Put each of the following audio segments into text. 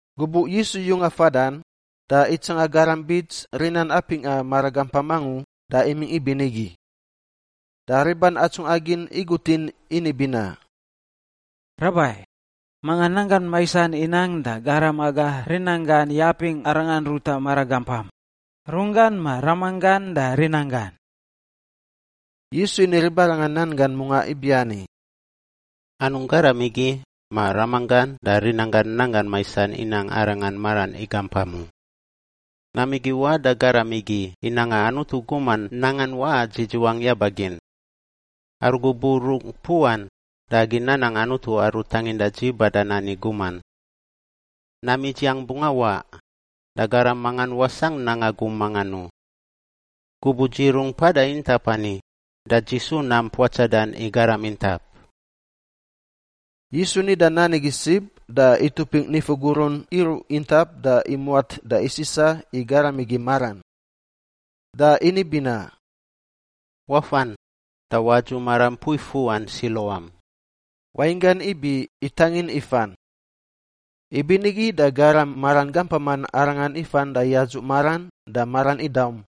Gubuꞌ Yisu yunga fadan, da itsanga garam bits rinan apingꞌa maragampam angu da imingꞌ ibinigi. Da riban atsungꞌa gin igutin ini binaꞌ, “Rabai, manga nanggan maisan inang da garam aga rinanggan yapingꞌ arangan ruta maragampam — runggan ma ramanggan da rinanggan?” Yisu ini ribarangan nan gan mungaꞌ ibiani, “Anungꞌ garam igi ma ramanggan da rinanggan nanggan maisan inang arangan maran igampam u. Nam igi iwaꞌ da garam igi i nanga Anutu guman nangan waꞌa dzidziwan yaba gin. Aru gubuꞌ rungꞌ puꞌan da agi nanang Anutu aru tanginda dzi badan ani guman. Nam idziang bungꞌ awaꞌ, da garam mangan wasangꞌ nanga gum mangan u. Gubuꞌ dzi rungꞌ mpada intap ani da dzi isu nam puatsadan i garam intap.” Yisu nida nan igi sib da itupingꞌ nifu gurun iruꞌ intap da imuat da isisa i garam igi maran. Da ini binaꞌ, “Wafan da wadzuꞌ maram mpui fuꞌan Siluam” (wainggan ibi ‘itangin ifan’). Ibinigi da garam maran gampaman arangan ifan da yadzuꞌ maran da maran idaum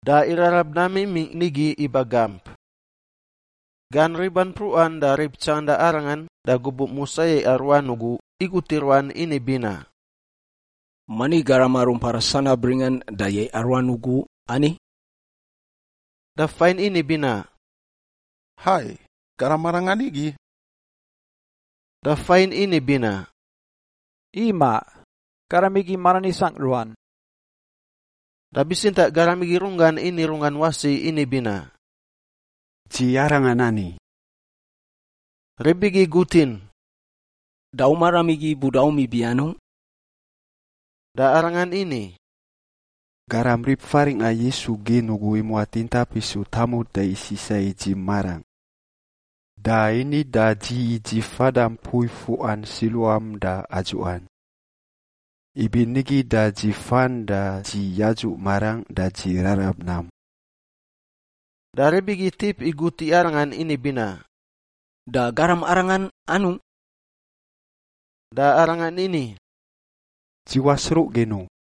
da irarab nam imingꞌ nigi iba gamp. Gan riban mpruꞌan da rib tsanganda arangan da gubuꞌ musa yaiꞌa ruan ugu igut i ruan ini binaꞌ, “Mani garam aru mpada sanab ringan da yaiꞌa ruan ugu ani?” Da fain ini binaꞌ, “Hai! Garam arangan igi.” Da fain ini binaꞌ, “Imaꞌ! Garam igi maran isangꞌ ruan.” Da bitsintaꞌ garam igi runggan ini runggan wasi ini binaꞌ, “Dzi arangan ani.” Rib igi igutin, “Da u maram igi budaum ibi anungꞌ?” Da arangan ini, “Garam rib faringꞌa Yisu gin ugu imuat intap isu tamut da isisa i dzi marangꞌ. Da ini da dzi i dzi fada mpui fuꞌan Siluam da adzuꞌan. Ibinigi da dzi fan da dzi yadzuꞌ marangꞌ da dzi rarab nam.” Da rib igi itip igut i arangan ini binaꞌ, “Da garam arangan anungꞌ?” Da arangan ini, “Dzi wasruꞌ gin u.”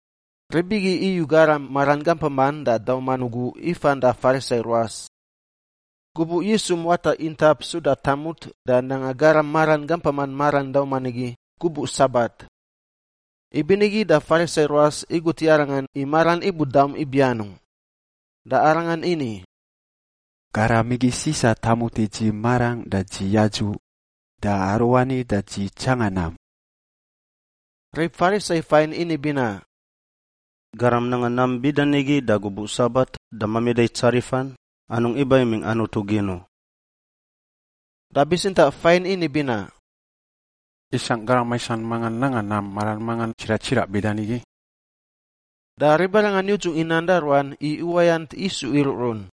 Rib igi iyu garam maran gampaman da dauman ugu ifan da Farisai ruas. Gubuꞌ Yisu muata intap suda tamut da nanga garam maran gampaman maran dauman igi gubuꞌ Sabat. Ibinigi da Farisai ruas igut i arangan i maran ibudaum ibi anungꞌ. Da arangan ini, “Garam igi sisa tamut i dzi marangꞌ da dzi yadzuꞌ, da aruani da dzi tsanga nam.” Rib Farisai fain ini binaꞌ, “Garam nanga nam bida nigi da gubuꞌ Sabat da mamida i tsarifan, anungꞌ iba imingꞌ Anutu gin u.” Da bitsintaꞌ fain ini binaꞌ, “Isangꞌ garam maisan mangan nanga nam maran mangan tsiraꞌ tsiraꞌ bida nigi?” Da ribarangan yudzung i nan da ruan i uwayant isu iruꞌrun.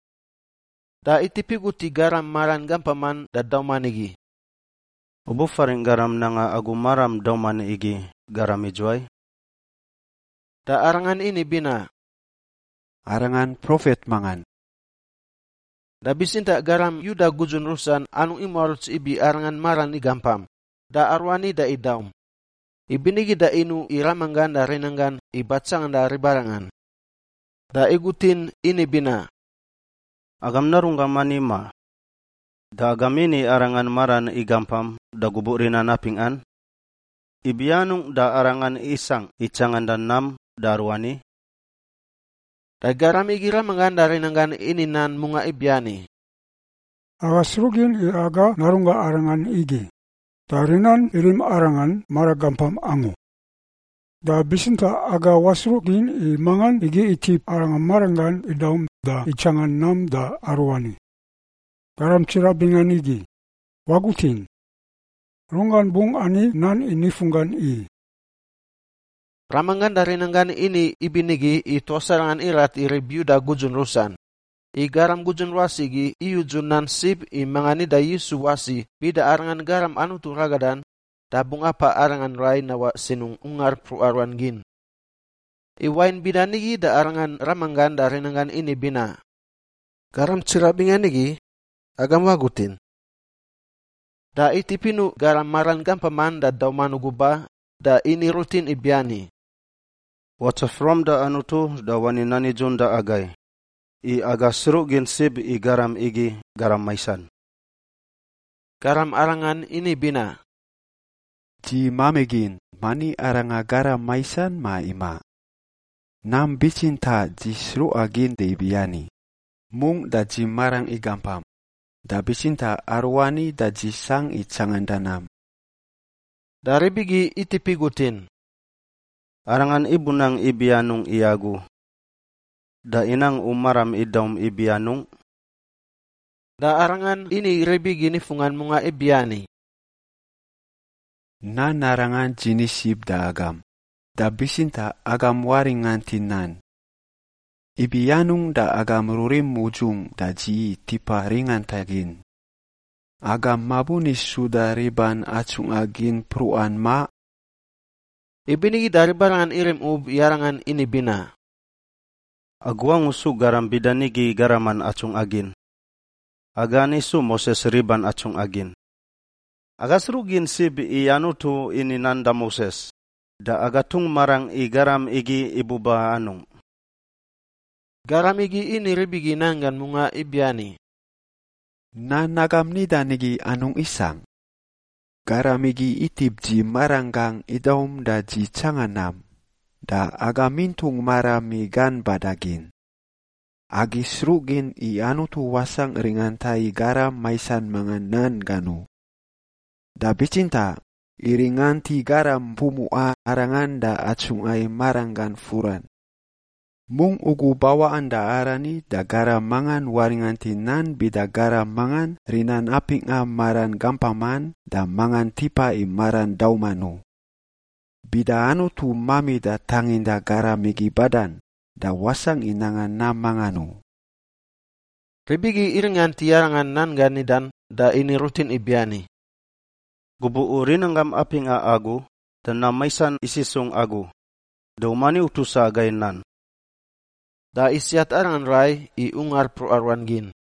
Da itip igut i garam maran gampaman da dauman igi, “U bufaringꞌ garam nanga agu maram dauman igi garam idzuwai?” Da arangan ini binaꞌ, “Arangan profet mangan.” Da bitsintaꞌ garam Yuda gudzun rusan anungꞌ imuaruts ibi arangan maran igampam, da aruani da idaum, ibinigi da inuꞌ i ramanggan da rinanggan i batsanganda ribarangan. Da igutin ini binaꞌ, “Agam narunggam ani, ma? Da agam ini arangan maran igampam da gubuꞌ rinan apingꞌan? Ibi anungꞌ da arangan isangꞌ i tsanganda nam da aruani?” Da garam igi ramanggan da rinanggan ini nan mungaꞌ ibiani, “Aga sruꞌ gin i aga narunggangꞌ arangan igi da rinan irim arangan maragampam angu. Da bitsintaꞌ aga wasruꞌ gin i mangan igi itip arangan maranggan idaum da itsanga nam da aruani. Garam tsiraꞌ bingan igi! Wagutin! Runggan bungꞌ ani nan i nifunggan i.” Ramanggan da rinanggan ini ibinigi i tuas arangan irat i rib Yuda gudzun rusan, i garam gudzun ruas igi iyudzu nan sib i manga nida Yisu wasi bida Arangan Garam Anutu ragadan da bungꞌ apaꞌ arangan rai nawaꞌ sinungꞌ ungar mpruꞌa ruan gin. I wain bida nigi da arangan ramanggan da rinanggan ini binaꞌ, “Garam tsiraꞌ bingan igi! Agam wagutin!” Da itip inuꞌ garam maran gampaman da dauman ugu ba da ini rutin ibiani, “Watsaf ruam da Anutu da wani nan nidzun da agai, i aga sruꞌgin sib i garam igi garam maisan.” Garam arangan ini binaꞌ, “Dzi mamigin mani arangan garam maisan ma imaꞌ. Nam bitsintaꞌ dzi sruꞌa gin da ibiani, mungꞌ da dzi marangꞌ igampam, da bitsintaꞌ aruani da dzi sangꞌ i tsanganda nam.” Da rib igi itip igutin, “Arangan ibunang ibi anungꞌ i agu? Da inang u maram idaum ibi anungꞌ?” Da arangan ini rib igi nifunggan mungaꞌ ibiani, “Nan arangan dzi ni sib da agam, da bitsintaꞌ agam waringant i nan! Ibi anungꞌ da agam rurim udzungꞌ da dzi i tipa ringanta gin? Agam mabuni suda i riban atsungꞌa gin mpruꞌan, ma?” Ibinigi da ribarangan irim ub i arangan ini binaꞌ, “Agu angu su garam bida nigi garaman atsungꞌa gin! Aga ani su Moses riban atsungꞌa gin. Aga sruꞌ gin sib i Anutu ini nan da Moses, da aga tungꞌ marangꞌ i garam igi ibuba anungꞌ.” Garam igi ini rib igi nan gan mungaꞌ ibiani, “Nan agam nidan igi anungꞌ isangꞌ! Garam igi tip dzi maranggangꞌ idaum da dzi tsanga nam, da agam itungꞌ maram i gan bada gin. Agi isruꞌ gin i Anutu wasangꞌ ringanta i garam maisan mangan nan gan u. Da bitsintaꞌ iringant i garam pumuꞌa Arangan da atsungꞌa i maranggan furan. Mungꞌ ugu bawaꞌan da arani da garam mangan waringant i nan bida garam mangan rinan apingꞌa maran gampaman da mangan tipa i maran dauman u. Bida Anutu mamida tanginda garam igi badan, da wasangꞌ i nanga nam mangan u.” Rib igi iringant i arangan nan gan nidan da ini rutin ibiani, “Gubuꞌ u rinanggam apingꞌa agu, da nam maisan isisungꞌ agu! Da u mani utusa agai i nan!” Da isiat arangan rai i ungar mpruꞌa ruan gin.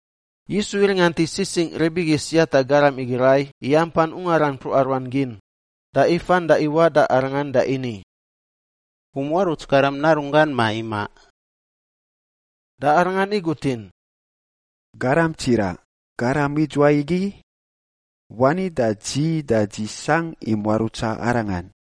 Yisu iringant i sisingꞌ rib igi siata garam igi rai i ampan ungaran mpruꞌa ruan gin, da ifan da iwaꞌ da arangan da ini, “U muaruts Garam Narunggan, ma imaꞌ?” Da arangan igutin, “Garam tsiraꞌ, garam idzuwai igi? Wani da dzi, da dzi sangꞌ i muarutsa Arangan.”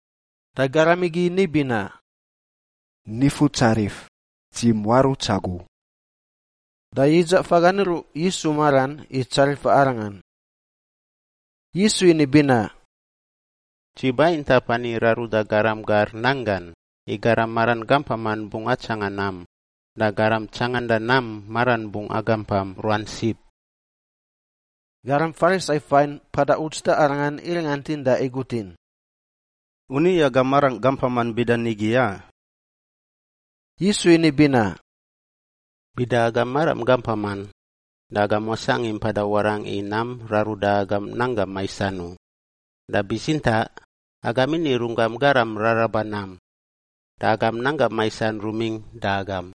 Da garam igi ni binaꞌ, “Nifutsarif! Dzi muaruts agu.” Da yidza fagan iruꞌ Yisu maran i tsarifa Arangan. Yisu ini binaꞌ, “Dzi ba intap ani i raruda garam gar nanggan, i garam maran gampaman bungꞌ atsanga nam da garam tsanganda nam maran bungꞌ agampam ruan sib.” Garam Farisai fain mpada uts da Arangan iringantin da igutin, “U ni aga marangꞌ gampaman bida nigi, a?” Yisu ini binaꞌ, “Bida agam maram gampaman, da agam wasangꞌ i mpada warangꞌ i nam raruda agam nanggam maisan u, da bitsintaꞌ agam ini runggam garam raraba nam, da agam nanggam maisan rumingꞌ da agam.”